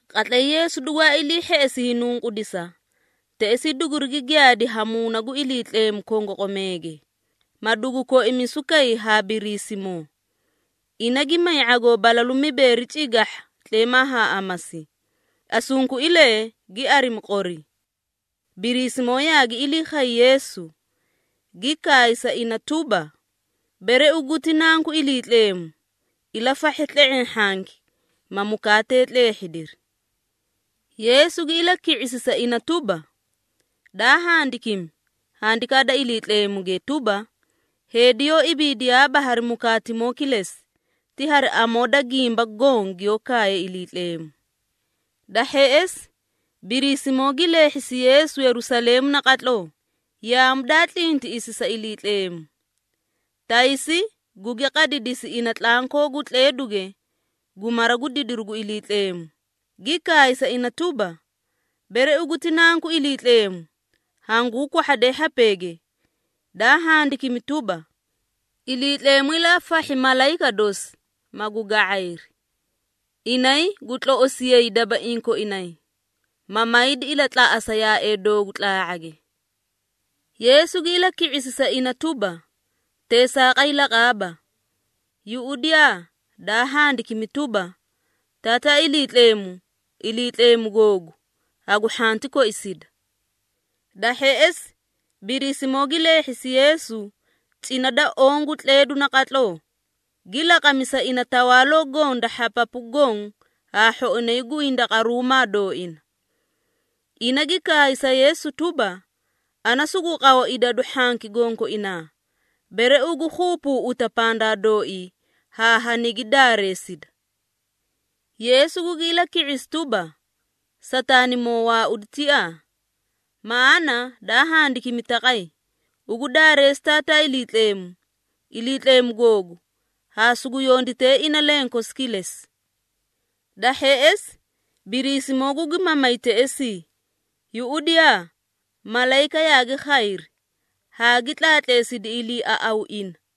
Qatlay Yeesu dugwaa ilii hheꞌesi hiinunqudisa, teꞌesaa dugurigi giyaadi ha Muuna gu Iliitleemu kongoqomeege, ma dugu koimisu kay ha Biriisimoo. Ina gi may ⁄agoo balalu mibeeri cigahha tleemaa haa amasi, asunkuilee gi arimi qori. Biriisimoo yaagi ilii khay Yeesu, gi kaay sa ina tuba, “Bere ugu ti Nanku Iliitleemu, ilafahhe tle⁄eẽ hhanki, ma mukaatee tleehhidiri.” Yeesu gi ilaki⁄isi sa ina tuba, “Daa handikimi, Handikaa da Iliitleemuge tuba, ‘Heedi yoó ibiidiyaaba hari ⁄agoo kilesi, ti ibiidi hari kila gimba goõ giyoó kaaye Iliitleemu.’” Da hheꞌesi, Biriisimoo gi leehhisi Yeesu Yerusaleemu naqatloo, yaamu daa tlintiꞌisi sa Iliitleemu. Taysi gugi qadidisi ina tlankoo gu tleeduge gu mara gu didiru gu Iliitleemu, gi kaay sa ina tuba, “Bere ugu ti Nanku Iliitleemu, hanguu kwahhade hhapeege. Daa handikimi tuba, ‘Iliitleemu ilafahhi malayika dosi, magu ga⁄ayri. Inay gu tloꞌosiyay dabaiĩ koinay, ma maydi ilatlaꞌasa yaaee doogu tlaa⁄age.’” Yeesu gi ilaki⁄isi sa ina tuba, “Teesaaqay laqaaba. Yuꞌudiyaa daa handikimi tuba, ‘Taataa Iliitleemu, Iliitleemu googu, hagu hhanti koisida.’” Da hheꞌesi, Biriisimoo gi leehhisi Yeesu cina da oõ gu tleedu naqatloo, gi laqami sa ina tawaaloo goõ da hhapapu goõ haa hhoinay gu hindaqaruumaa dooina. Ina gi kaay sa Yeesu tuba, “Ana sugu qaw idadu hhanki gonkoinaa, bere ugu keebeeꞌeta pandaa dooii haa hanigi daareesida.” Yeesu gugi ilaki⁄isi tuba, “Sataanimoo, waaudi tiaa! Maꞌaana daa handikimi taqay, ‘Ugu daareesi Taataa Iliitleemu, Iliitleemu googu, haa sugu yondite ina lenkosi kilesi.’” Da hheꞌesi, Biriisimoo gugi mamay teꞌesii. Yuꞌudiyaa! Malayika yaagi khayri, haa gi tlaatleesiri iliiaꞌaw ina.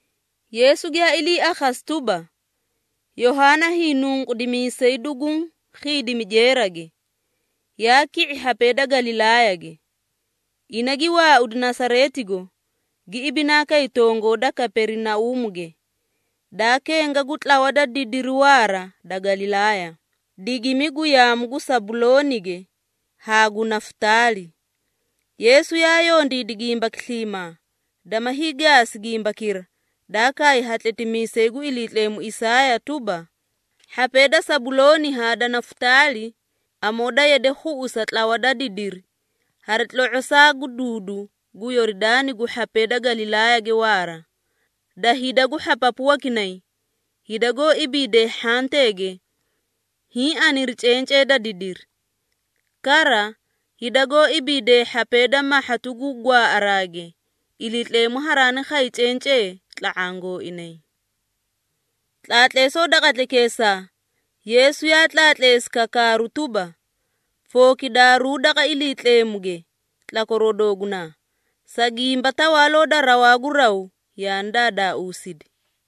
Yeesu giyaa ilii akhasi tuba, Yohaana Hiinunqudimiisay duguũ khiidimi jeerage, yaa ki⁄i hhapee da Galilaayage. Ina gi waaudi Nasareetigo, gi ibinaa kay tongoo da Kaperinauumuge, daa kenga gu tlawa da didiri waara da Galilaaya, digimi gu yaamu gu Sabuloonige haa gu Nafutaali. Yeesu yaa yondiidi gimbaki sliimaa, dama hiigaasi gimbakira, daa kaay ha tletimiisay gu Iliitleemu Isaaya tuba, “Hhapee da Sabulooni haa da Nafutaali, amoo daa yade khuꞌusidi tlawa da didiri, hari tlo⁄osaa gu duudu gu Yoridaani gu hhapee da Galilaayage waara, da hida gu hhapapu wakinay, hida goó ibiidee hhanteege, hiĩ aniri cencee da didiri. Kara, hida goó ibiidee hhapee da mahhatu gu gwaaꞌaraage, Iliitleemu haraani khay cencee tla⁄aã gooinay.” Tlaatleesoo da qatlaykeesaa Yeesu yaa tlaatleesi kakaaru tuba, “Fookidaaruu daqa Iliitleemuge tlakwaroo doogunaa, sa gimba Tawaaloo da rawaa gu raw yaani daadaausidi.”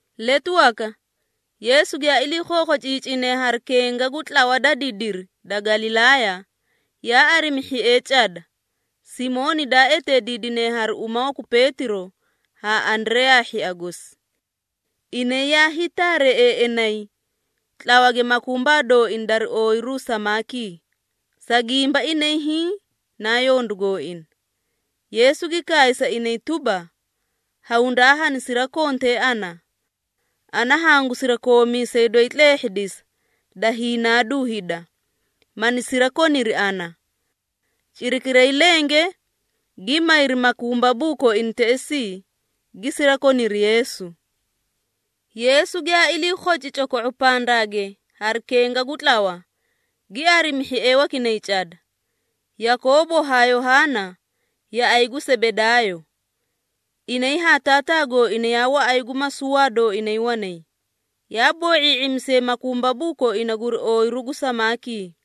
Letu waka, Yeesu giyaa ilii khookhociicine hari kenga gu tlawa da didiri da Galilaaya, yaa arimi hhiee cada, Simooni daa eteediidine hari uma waku Peetiro haa Andareyaa hhia gosi. Inay yaa hiitaareeꞌeeꞌenay tlawage makumbaa dooina dari ooyiru samaakii, sa gimba inay hiĩ naa yondu gooina. Yeesu gi kaay sa inay tuba, “Hawundaa hani sirakontee ana. Ana hangu sirakoomiisee doyi tleehhidisa da hiinaadu hida, mani sirakoniri ana.” Cirakiray lenge gi mayri makumbabuu koina teꞌesii, gi sirakoniri Yeesu. Yeesu giyaa ilii khoci coko⁄o pandaage hari kenga gu tlawa, gi arimi hhiee wakinay cada, Yakoobo haa Yohaana, yaꞌay gu Sebedaayo. Inay haa taataa gooina yaa waꞌay gu masuwaa dooinay wanay, yaa boo⁄ii⁄imisiyay makumbabuu koina guri ooyiru gu samaakii.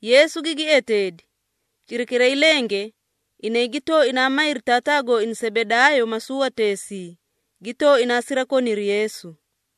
Yeesu gigi eteedi. Cirakiray lenge, inay gi tooinaa mayri taataa gooina Sebedaayo masuwateesii, gi tooinaa sirakoniri Yeesu.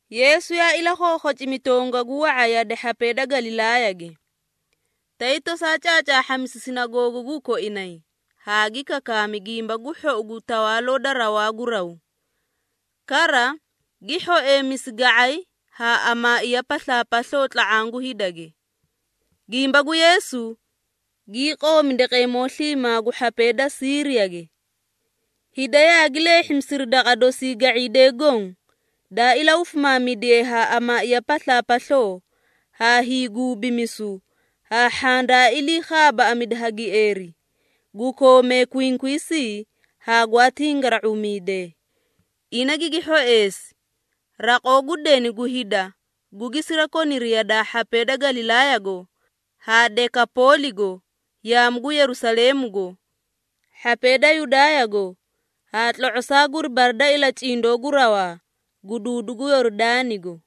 Yeesu yaa ilakhookhocimi tongagu wa⁄a yade hhapee da Galilaayage, tay tosaa caacaahhamisi sinagoogaguu koinay haa gi kakaami Gimba gu Hhou gu Tawaaloo da rawaa gu raw. Kara, gi hhoeemisi ga⁄ay haa amaaiya paslaapasloo tla⁄aã gu hidage. Gimba gu Yeesu gii qoomi daqeemoo sliimaa gu hhapee da Siiriyage. Hida yaagi leehhimisiri daqa dosii ga⁄iidee goõ, daa ilahufimaamidiye ha amaaiya paslaapasloo ha hiiguubimisu, haa hhaã daa ilii khaabaaꞌamidi ha gieeri, gu koomee kwinkwiisii haa gwaa tingara⁄uumidee. Ina gigi hhoeesi. Raqoo gu deni gu hida gugi sirakoniri yadaa hhapee da Galilaayago haa Dekapooligo, yaamu gu Yerusaleemugo, hhapee da Yudaayago haa tlo⁄osaa guri bara da ilacindoo gu rawaa gu duudu gu Yoridaanigo.